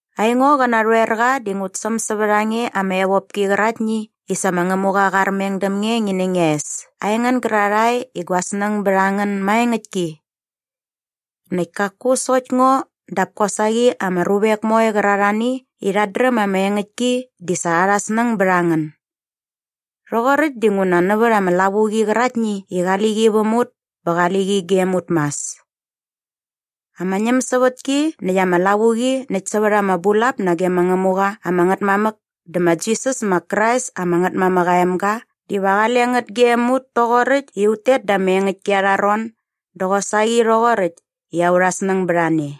Aingo qä narhoerqa di ngut säm sävät a nge ama evopki qäraktni i sa ma Ngämuqa qa armeng däm nge ngi nä ngia es aingän gärarhae i gua snäng bät a ngän maengäktki. Näkt kaku sokt ngo dap kosaqi ama ruvek moe qärarhani i rhat dräm ama engäktki di sa arha snäng bät a ngän. Rhoqoräkt dinguna nävät ama lavuqi qäraktni i qali qi väm ut bä va qali qi gem ut mas. Ama ñämsävätki näkt ama lavuqi näkt sävät ama bulap nage ma Ngämuqa ama Ngätmamäk dä ma Jisas ma Krais ama Ngätmamäk aa emga diva qale ngät gem ut toqoräkt i ut tet da ama engäktki arha ron dä qosaqi rhoqoräkt i aurha snäng bät a ne.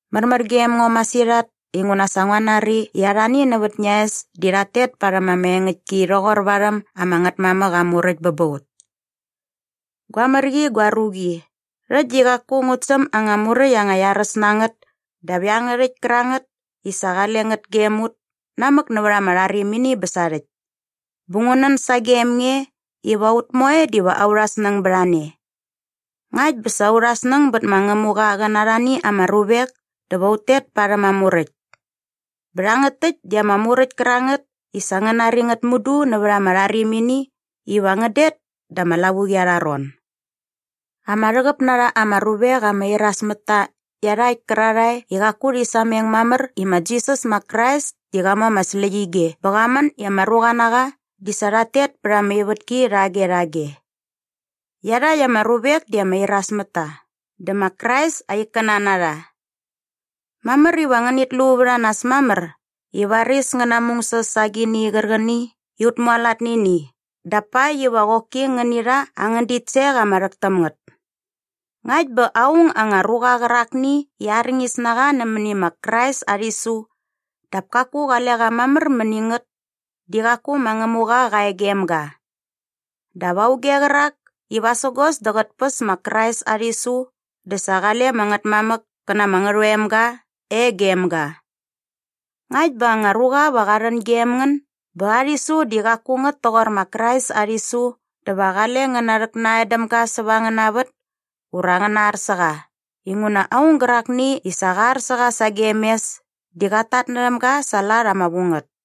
Märmär gem ngo masirhat inguna sa ngua nari i arhani nävät ngia es di rhat tet parhäm ama engäktki rhoqor varhäm ama Ngätmamäk aa muräkt bä ba ut. Gua mär qi gua ruqi, rhäkt di qaku ngut säm anga muräkt anga iaräs na ngät dap iangärhäkt kärangät i sa qale ngät gem ut namäk nävät ama rharimini bä sarhäkt. Bä ngu nän sagem nge iva ut moe diva aurha snäng bät a ne. Ngakt bä sa aurha snäng bät ma Ngämuqa qä na arhani ama ruvek dä va ut tet parhäm aa muräkt. Bä rhangät täkt di ama muräkt kärangät i sa ngän nari ngät mudu nävät ama rharimini iva ngän det da ama lavuqi arha ron. Ama rhäqäp na rha ama ruvek ama iras mät ta iarhakt kärarhae i qaku rhi sameng mamär i ma Jisas ma Krais di qa mu ama släqyige bä qa män i ama ruqa na qa di sa rhat tet pät ama ivätki rhage rhage. Iarhakt ama ruvek di ama iras mät ta dä ma Krais aa ikkäna na rha. Mamär iva ngänit lu vät a nas mamär i varis ngän namungsäs sa agini qärqäni i ut mualat nani ini dap pakt iva qoki ngäni rha angän ditsek ama rhäk täm ngät. Ngakt bä aung anga ruqa qärakni i arñis na qa nämäni ma Krais aa rhisu dap kaku qale qa mamär mäni ngät di qaku ma Ngämuqa qa e gem ga. Dap auge qärak i vasägos dä qät päs ma Krais aa rhisu dä sa qale ama Ngätmamäk kä na ama Ngärhoemga e gem ga. Ngakt bä anga ruqa va qa rhän gem ngän bä aa rhisu di qaku ngät toqor ma Krais aa rhisu dä va qale ngän narhäknan däm ga säva angäna vät ura ngän nar sä qa inguna aung gärakni i sa qa ar sä qa sagem mes di qat tatnärhäm ga sa aa lat ama vu ngät.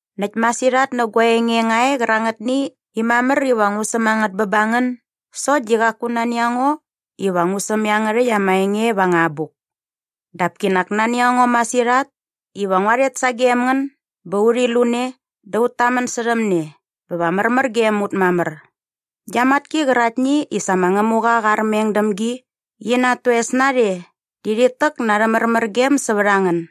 Näkt masirhat nä gua enge nga e qärangätni i mamär iva ngu säm a ngät bä ba ngän sokt di qaku nani a ngo iva ngu säm iangärhäkt ama enge va anga abuk. Dap kinak nani a ngo masirhat iva ngua rhet sagem ngän bä urhi lu ne dä ut tamän särhäm ne bä va märmär gem ut mamär. Gia matki qäraktni i sa ma Ngämuqa qa armeng däm gi qi na at toes narhe di rhit täk na arhä märmärgem sävät a ngän.